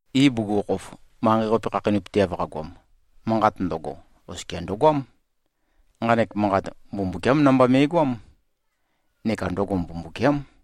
Ibugukhokhof, manqei-qape khakheinøpøteav qagoam, Manqat ndøgo, oskia ndøgoám. Nqanek Manqat Mbumbukiám namba me꞉goám, neka ndøgo Mbumbukiám.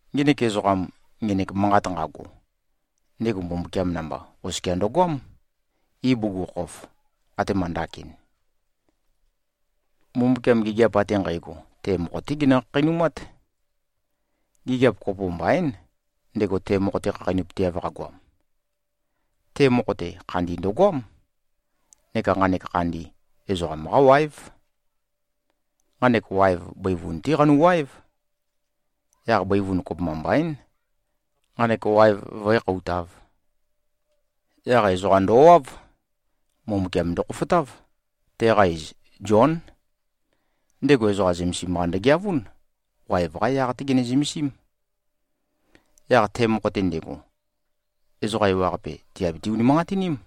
Ngenek ezoqam, ngenek Manqat nqago, ndego Mbumbukiam namba oskia ndøgoám, ibugukhokhof, atema ndakin. Mbumbukiam gigiap ate nqægo, te mokho-té genø-khakheinumát. Gigiap kopo mbaín, ndego te mokho-te khakheinøpøteav qagoam. Te mokho-te, khandi ndøgoám. Neka nqanek khandi, ezoqam-qá wáev. Nqanek waev bøivun-té qanuwaév. Yaq bøivun, kopømba mbaín, nqanek waev vǿe-khoutāv. Yaq ezoqa ndowáv. Mbumbukiam ndokhofotáv. Teqa iz Zión. Ndego ezoqa zømesim-qa ndøgeavún. Waev-qá yaq-té gené-zømesím. Yaq te mokho-te ndego, ezoqa ewaqape, tìabiti-unimanqatiním.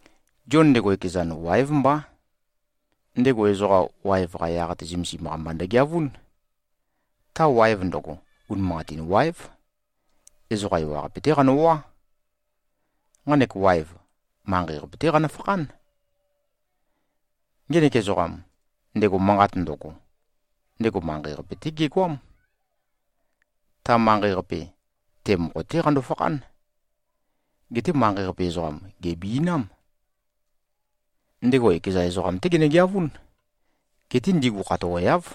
Zion ndego ekezan, wáev mbá. Ndego ezoqa waev-qa yaq-te zømesim-qa mba ndøgeavún. Ta waev ndøgo, unimanqatin wáev. Ezoqa ewaqape-té qanøwá. Nqanek waev, manqei-qape-té qanøfakhán. Ngenek ezoqam, ndego Manqat ndøgo, ndego manqei-qape-té gegoám. Ta manqei-qape, te mokho-té qando-fakhán. Geté manqei-qape ezoqam, gèbi꞉nám. Ndego ekeza ezoqam-té genøgeavún. Geté ndigu khatoweáv.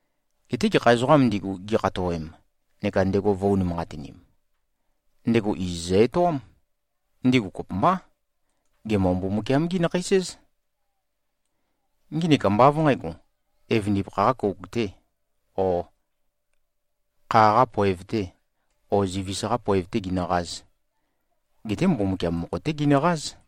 Geté gekha ezoqām ndigu, gikhatowem neka ndego vø̄-unimanqatinim, ndego iz zø-etoám. Ndigu kopømbá, gemø-Mbumbukiam-gí-nakheis-éz. Nginik ambá av nqǣgo, evøndipakha-qā kouk-tē o kha-qā poev-tē o zivis-qā poev-tē ginøqāz. Geté Mbumbukiam mokho-té ginøqáz.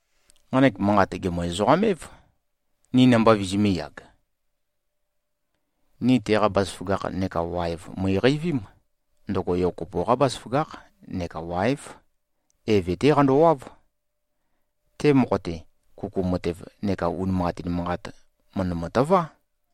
Nqanek Manqat gèmø-ezoqam-év, ni namba vizimīyag. Ni teqa bazaføgakh neka waev mø̀iqeivím. Ndøgo Yo kopo-qá bazaføgákh neka wáev. Eve-té qandowáv. Te mokho-te, kuku matev neka unimanqatin manqat, mø̀ndømø-tøvá.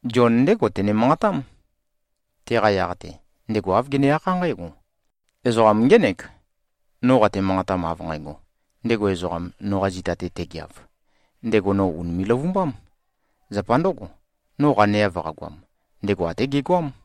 Zion ndégo tene-manqatám. Teqa yaq-te, ndego āv gene-akhá nqǽgo, “Ezoqam ngének, no qate-manqatam av nqægo: Ndego ezoqam, noqa zita-te tegeav, ndego no ùnime꞉-løvumbám. Zapa ndǿgo, no qaneav qagoam, ndego até gegoám.”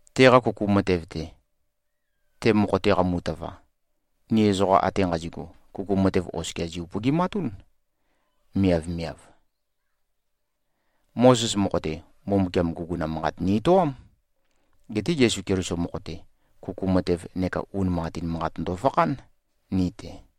Teqa kuku matev-te, te mokho-te qamu-tøva, ni ezoqa ate nqazi꞉gu, kuku matev oskia zi-upøgimatún, miavmiav. Mozes mokho-te, Mbumbukiam guguna manqat ni-etoám. Geté Yesu Keliso mokho-te, kuku matev neka unimanqatin manqat ndofakhán, ni-te.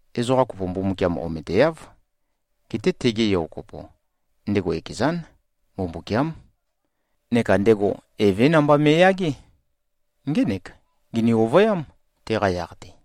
Ezoqa kopo Mbumbukiam ometeáv. Geté tege Yo kopo, ndego ekezán, Mbumbukiám. Neka ndego Evé namba me꞉yagé. Ngének, gini-ovøyám, teqa yaq-te.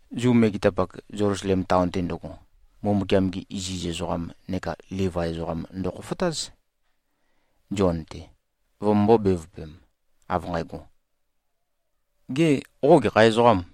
Zu megetapak, Zelusalem taon-te ndøgo, Mbumbukiam-gi iziz ezoqam neka Livai ezoqam ndøkhofotáz, Zion-te, vømømbō-bevøpem, av nqægo, “Gê, qo gekha ezoqâm?”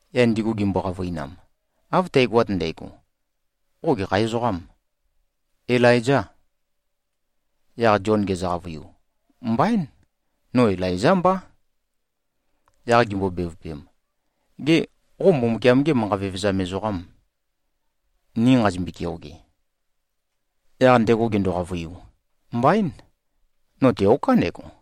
Yaq ndigu gimbo-qavøinam, “Av tægoat ndægo, qo gekha ezoqâm? Ilaizâ?” Yaq Zion gezø-qavøiu, “Mbaín. No Ilaizá mbá.” Yaq gimbo-bevøpem, “Gê, qo Mbumbukiam-gê manqa vevezam ezoqàm, ni nqazimbøe-keoge?” Yaq ndego gendo-qavøiu, “Mbaín. No teoká ndego.”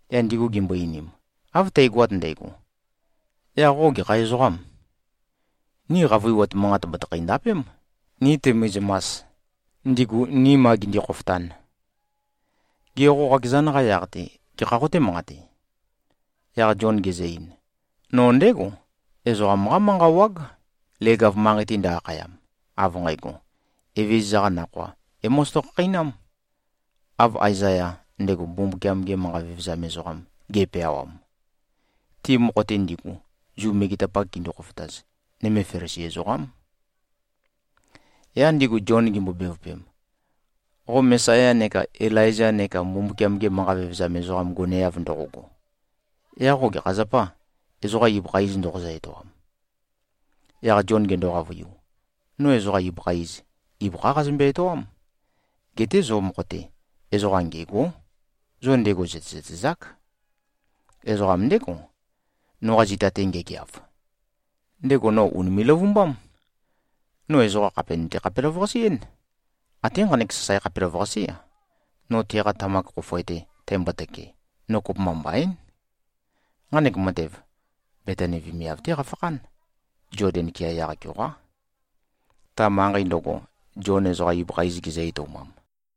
Yaq ndigu gimbo-einim, “Av tægoat ndægo, yaq qo gekha ezoqâm? Ni qavøiwat manqat batikhæ-ndapém, ni tømizømas, ndigu, ni ma gindi-khofotan. Gê, qo qakezan-qa yaq-te gekhā qoté-manqate?” Yaq Zion gezø-ein, “No ndégo, ezoqam-qá manqa wág, leg-av manqei-te ndø-akhayam, av nqægo, ‘Evezøza-qa nakhoa é-mozoto-khakheinám.’ Av Aezaya, ndego Mbumbukiam-ge manqa vevezam ezoqam, ge꞉peawam.” Ti mokho-te ndigu, Zu megetapak gindu-khofotaz, nøme Felisi ezoqám. Yaq ndigu Zion gimbo-bevøpem, “Qo Mesaya neka Ilaiza neka Mbumbukiam-ge manqa vevezam ezoqam goneav ndoqogo, yaq qo gekha zapâ, ezoqa ibøkha iz ndoqozø-etoam?” Yaq Zion gendo-qavøiu, “No ezoqa ibøkha iz, ibøkhá qazømbe-etoám. Geté zo mokho-te, ezoqam ngêgó. Zo ndego zø̀tezøtezák. Ezoqam ndégo, noqa zita-te ngegeav. Ndego no ùnime꞉-løvumbám. No ezoqa khàpe nøte-khapelavøqase-én. Até nqanek sasae khapelavøqasé-a, no teqa tamak khofoe-te tæmbotøke, no kopømba mbaín.” Nqanek matev, Betani vemiav-té qafakhán. Zoden kea yaq-keoqá, ta manqei ndøgo, Zion ezoqa ibøkha iz gezø-etoumam.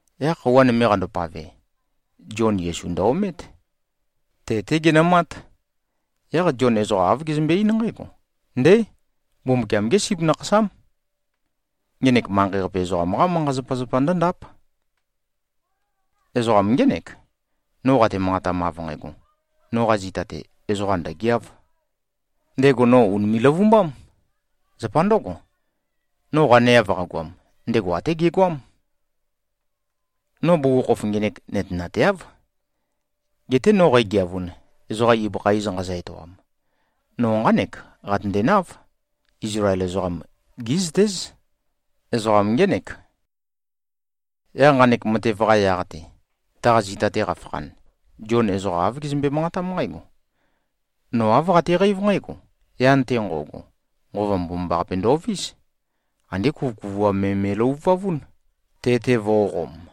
Yaq khøuwa nøme qandopave, Zion Yesu ndø-omét. Te-té genømát. Yaq Zion ezoqa āv gezømbe-eín nqǽgo, “Ndé! Mbumbukiam-gé Sip Nakhasám. Ngenek manqei-qape ezoqam-qá manqa-zapazapa ndǿndáp. Ezoqam ngének, no qate-manqatam av nqægo, ‘Noqa zita-te, ezoqa ndø̀geáv. Ndego no ùnime꞉-løvumbám. Zapa ndǿgo, no qaneav qagoam, ndego até gegoám.’ No bugukhokhof ngenek nøtenateáv. Geté no qægeavun, ezoqam ibøkha iz nqazø-etoam, no nqánek qatøndenáv, Izlael ezoqam gí꞉zøtéz, ezoqam ngének.” Yaq nqanek matev-qa yaq-te, taqa zita-te qafakhan, Zion ezoqa āv gezømbe-manqatám nqǽgo, “No āv qateqeív nqǽgo: Yan-te nqo꞉go, Nqova Mbomambaqape ndovís. Andé kuvøkuvuam me me꞉løvuvavún, te-te vō꞉qom.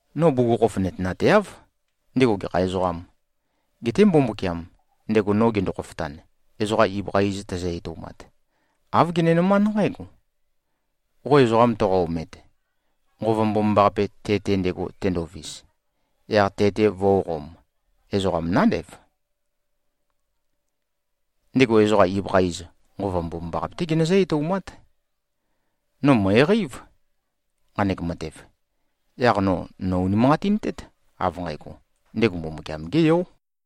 No bugukhokhof nøtenateáv, ndego gekha ezoqām. Geté Mbumbukiam, ndego no gendo-khofotan, ezoqa ibøkha iz tæzø-etoumat, āv genenømánd nqǽgo, ‘Qo ezoqam toqo-omet, Nqova Mbomambaqape te-te ndego tendovis, yaq te-te vó꞉qōm, ezoqam nándev. Ndego ezoqa ibøkha iz, Nqova Mbomambaqape-té genøzǿ-etoumát.’ No mø̀eqeív, nqanek matev. Yaq no nò-unimanqatintét, av nqægo, ndego Mbumbukiam-gé Yó.”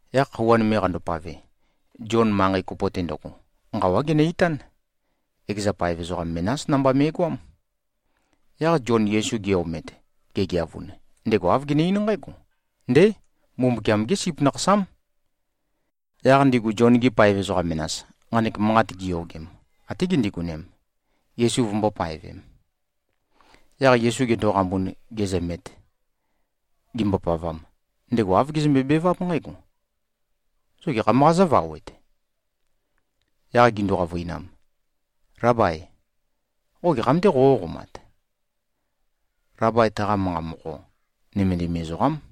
Yaq khøuwa nøme qandopave, Zion manqei kopo-te ndøgo, nqawá genø-itán. Ekeza paev ezoqa menás namba me꞉goám. Yaq Zion Yesu ge-omet, gegeavun, ndego āv gene-eín nqǽgo, “Ndé! Mbumbukiam-gé Sip Nakhasám.” Yaq ndigu Zion-gi paev ezoqa menas, nqanek manqat giyogem, até gindigonem, Yesu vømbō-paevem. Yaq Yesu gendoqambun, gezømet, gimbopavam, ndego āv gezømbe-beváp nqǽgo, “Zo gekham-qā zóvawet?” Yaq gindu-qavøinam, “Lábai, qo gekham-tē qoqó-qomat?” (Labai, taqa manqa mokho, “Nømendim ezoqám.”)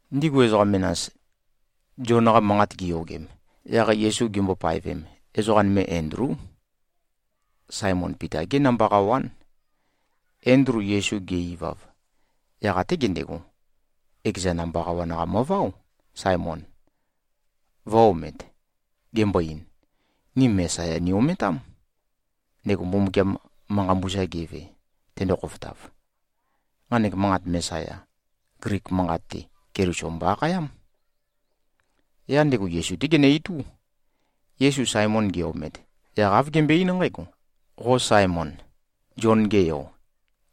Ndigu ezoqa menas, Zion-qa manqat giyogem, yaq Yesu gimbo-paevem, ezoqa nøme Endlú. Saemon Pita-gé namba qawán. Endlu Yesu ge-ivav, yaq até gendego, ekeza namba qawan-qa møváo, Saemon, vø̄-omet, gembo-ein, “Ni Mesaya ni-ometám, ndego Mbumbukiam manqa mbusa geve, tendo-khofotav.” (Nqanek manqat, Mesaya, Glik manqat-te, Keliso mbo-akhayám.) Yaq ndego Yesu-té genø-itú. Yesu Saemon ge-omet, yaq āv gembøe-eín nqǽgo, “Qo Saemon, Zion-ge yo,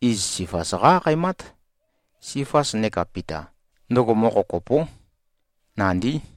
iz Sifas qá-akhaemát.” (Sifas neka Pita, ndøgo mokho kopó, nandí.)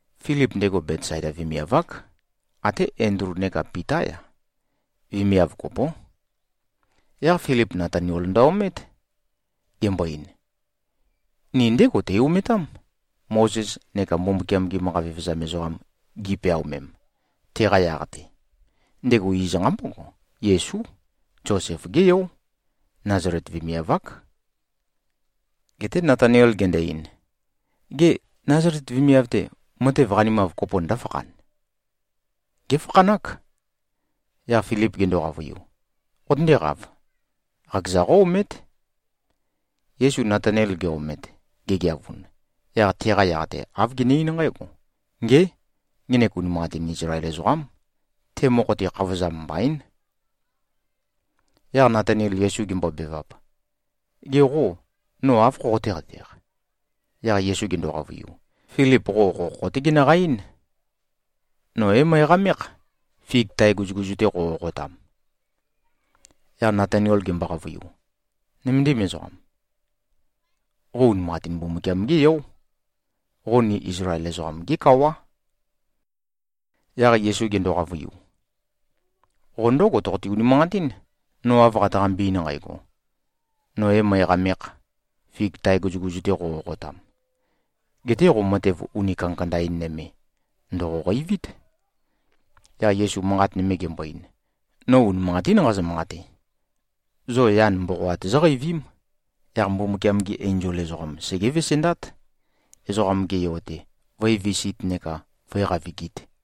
Filip, ndego Betsaida vemiav-ák. Até Endlu neka Pitá-ya, vemiav kopó. Yaq Filip Natanael ndø-omét. Gembo-ein, “Ni ndégo tei-ometám, Mozes neka Mbumbukiam-gi manqa vevezam ezoqam gi꞉peaomem, teqa yaq-te. Ndego iz nqambógo, Yesú. Zosef-gé yó. Nazalet vemiav-ák.” Geté Natanael gendo-ein, “Gê, Nazalet vemiav-te, matev qanimav kopo ndǿfakhan? Géfakhanák.” Yaq Filip gendo-qavøiu, “Qotøndéqāv. Qakeza qó-omét.” Yesu Natanael ge-omet, gegeavun, yaq teqa yaq-te āv gene-eín nqǽgo, “Ngé! Ngenek unimanqatin Izlael ezoqám. Te mokho-te, khavozam mbaín.” Yaq Natanael Yesu gembobevap, “Ge qô, no áv khoqotéqateq?” Yaq Yesu gendo-qavøiu, “Filip qo okhokho-té genøqa-eín. No é-møeqamékh, fig tae guzuguzu-te qoqoqotam.” Yaq Natanael gembo-qavøiu, “Nøméndim ezoqam. Qo unimanqatín Mbumbukiam-gé yó. Qo ni Izlael ezoqam-gé kawá.” Yaq Yesu gendo-qavøiu, “Qo ndǿgo toqote-unimanqatín, no av qataqambe-ein nqægo, ‘No ē-møeqamēkh, fig tae guzuguzu-te qoqoqotam.’ Geté qo matev uni kandakanda-in nøme ndòqoqeivít.” Yaq Yesu manqat nøme gembo-ein, “No unimanqatín nqazø-manqate. Zo yan mboqoat zóqeivím. Yaq Mbumbukiam-gi enzol ezoqam segé-vesendát, Ezoqam-ge Yo-te vǿevisīt neka vǿe-qavigīt.”